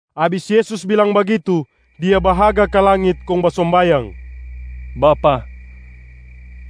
Abis Yesus bilang bagitu, Dia bahaga ka langit kong basombayang, “Bapa,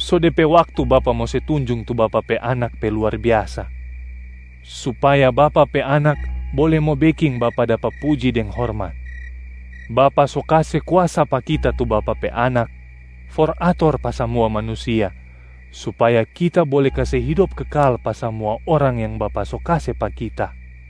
so de pe waktu Bapa mo se tunjung tu Bapa pe Anak pe luar biasa, supaya Bapa pe Anak bole mo beking Bapa dapa puji deng hormat. Bapa so kase kuasa pa Kita tu Bapa pe Anak for ator pa samua manusia, supaya Kita bole kase hidop kekal pa samua orang yang Bapa so kase pa Kita.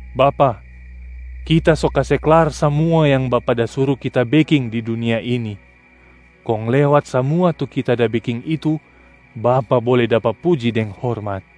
Bapa, Kita so kase klar samua yang Bapa da suru Kita beking di dunia ini, kong lewat samua tu Kita da beking itu Bapa bole dapa puji deng hormat.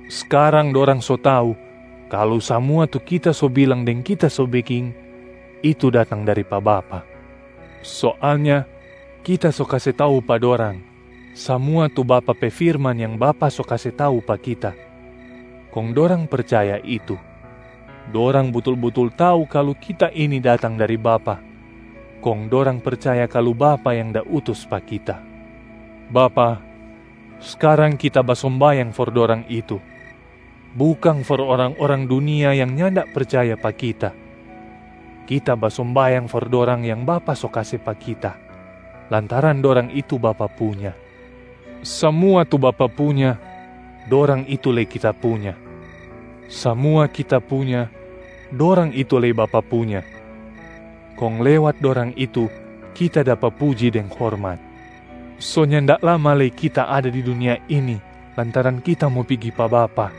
Skarang dorang so tau kalu samua tu Kita so bilang deng Kita so beking, itu datang dari pa Bapa. Soalnya Kita so kase tau pa dorang, samua tu Bapa pe firman yang Bapa so kase tau pa Kita, kong dorang percaya itu. Dorang butul-butul tau kalu Kita ini datang dari Bapa, kong dorang percaya kalu Bapa yang da utus pa Kita. Bapa, skarang Kita basombayang for dorang itu, bukang for orang-orang dunia yang nyanda percaya pa Kita. Kita basombayang for dorang yang Bapa so kase pa Kita, lantaran dorang itu Bapa punya. Samua tu Bapa punya, dorang itu lei Kita punya. Samua Kita punya, dorang itu lei Bapa punya. Kong lewat dorang itu Kita dapa puji deng hormat. So nyanda lama lei Kita ada di dunia ini lantaran Kita mo pigi pa Bapa.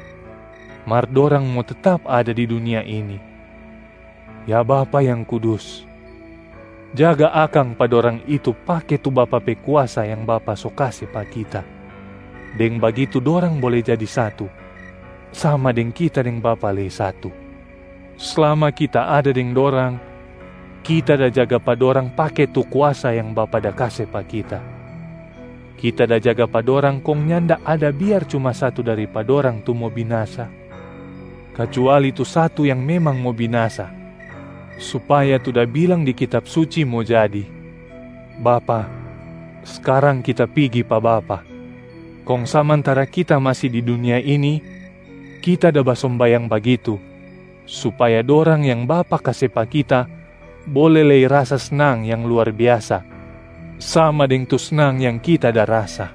Mar dorang mo tetap ada di dunia ini. Ya Bapa yang kudus, jaga akang pa dorang itu pake tu Bapa pe kuasa yang Bapa so kase pa Kita. Deng bagitu dorang bole jadi satu, sama deng Kita deng Bapa lei satu. Slama Kita ada deng dorang, Kita da jaga pa dorang pake tu kuasa yang Bapa da kase pa Kita. Kita da jaga pa dorang kong nyanda ada biar cuma satu dari pa dorang tu mo binasa, kacuali tu satu yang memang mo binasa supaya tu da bilang di Kitab Suci mo jadi. Bapa, skarang Kita pigi pa Bapa, kong samantara Kita masi di dunia ini Kita da basombayang bagitu, supaya dorang yang Bapa kase pa Kita bole lei rasa snang yang luar biasa sama deng tu snang yang Kita da rasa.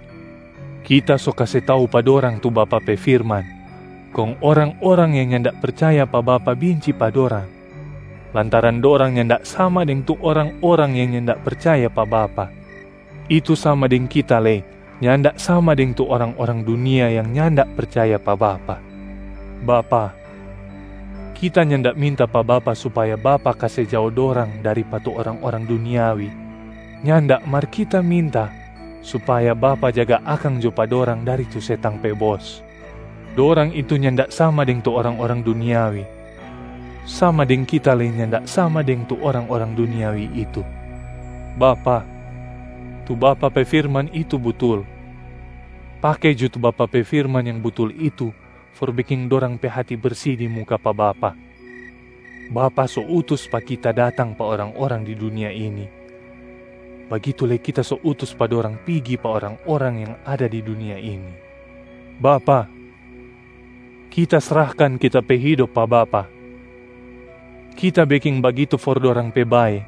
Kita so kase tau pa dorang tu Bapa pe firman kong orang-orang yang nyanda percaya pa Bapa binci pa dorang, lantaran dorang nyanda sama deng tu orang-orang yang nyanda percaya pa Bapa. Itu sama deng Kita lei nyanda sama deng tu orang-orang dunia yang nyanda percaya pa Bapa. Bapa, Kita nyanda minta pa Bapa supaya Bapa kase jao dorang dari pa tu orang-orang duniawi, nyanda mar Kita minta supaya Bapa jaga akang jo pa dorang dari tu setang pe bos. Dorang itu nyanda sama deng tu orang-orang duniawi, sama deng Kita lei nyanda sama deng tu orang-orang duniawi itu. Bapa, tu Bapa pe firman itu butul. Pake jo tu Bapa pe firman yang butul itu for beking dorang pe hati bersi di muka pa Bapa. Bapa so utus pa Kita datang pa orang-orang di dunia ini, bagitu lei Kita so utus pa dorang pigi pa orang-orang yang ada di dunia ini. Bapa, Kita srahkan Kita pe hidop pa Bapa. Kita beking bagitu for dorang pe bae,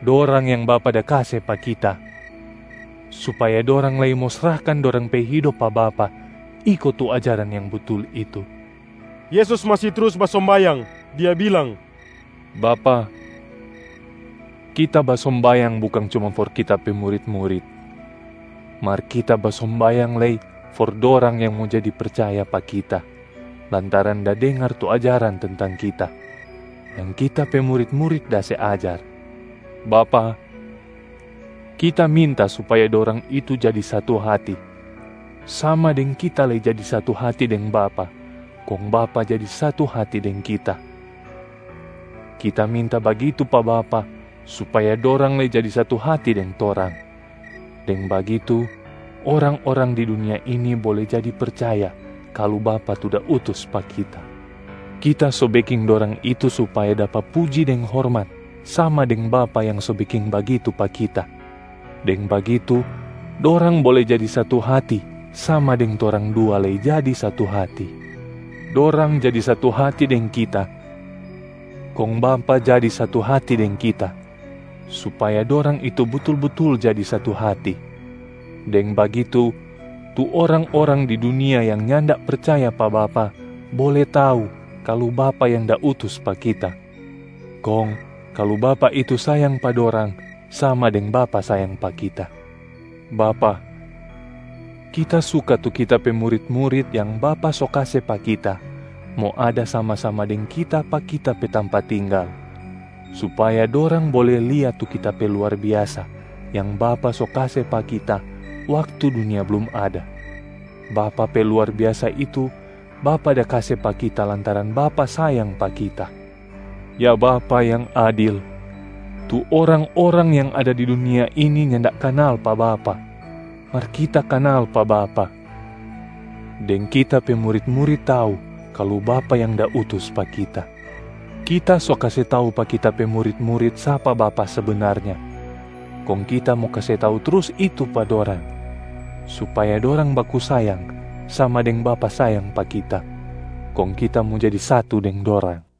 dorang yang Bapa da kase pa Kita, supaya dorang lei mo srahkan dorang pe hidop pa Bapa iko tu ajaran yang butul itu.” Yesus masi trus basombayang, Dia bilang, “Bapa, Kita basombayang bukang cuma for Kita pe murit-murit, mar Kita basombayang lei for dorang yang mo jadi percaya pa Kita lantaran da dengar tu ajaran tentang Kita, yang Kita pe murit-murit da se ajar. Bapa, Kita minta supaya dorang itu jadi satu hati, sama deng Kita lei jadi satu hati deng Bapa kong Bapa jadi satu hati deng Kita. Kita minta bagitu pa Bapa supaya dorang lei jadi satu hati deng Torang, deng bagitu orang-orang di dunia ini bole jadi percaya kalu Bapa tu da utus pa Kita. Kita so beking dorang itu supaya dapa puji deng hormat sama deng Bapa yang so beking bagitu pa Kita, deng bagitu dorang bole jadi satu hati sama deng Torang dua lei jadi satu hati. Dorang jadi satu hati deng Kita kong Bapa jadi satu hati deng Kita, supaya dorang itu butul-butul jadi satu hati. Deng bagitu, tu orang-orang di dunia yang nyanda percaya pa Bapa bole tau kalu Bapa yang da utus pa Kita, kong kalu Bapa itu sayang pa dorang sama deng Bapa sayang pa Kita. Bapa, Kita suka tu Kita pe murit-murit yang Bapa so kase pa Kita mo ada sama-sama deng Kita pa Kita pe tampa tinggal, supaya dorang bole lia tu Kita pe luar biasa yang Bapa so kase pa Kita waktu dunia blum ada. Bapa pe luar biasa itu Bapa da kase pa Kita lantaran Bapa sayang pa Kita. Ya Bapa yang adil, tu orang-orang yang ada di dunia ini nyanda kanal pa Bapa, mar Kita kanal pa Bapa. Deng Kita pe murit-murit tau kalu Bapa yang da utus pa Kita. Kita so kase tau pa Kita pe murit-murit sapa Bapa sebenarnya, kong Kita mo kase tau trus itu pa dorang, supaya dorang baku sayang sama deng Bapa sayang pa Kita, kong Kita mo jadi satu deng dorang.”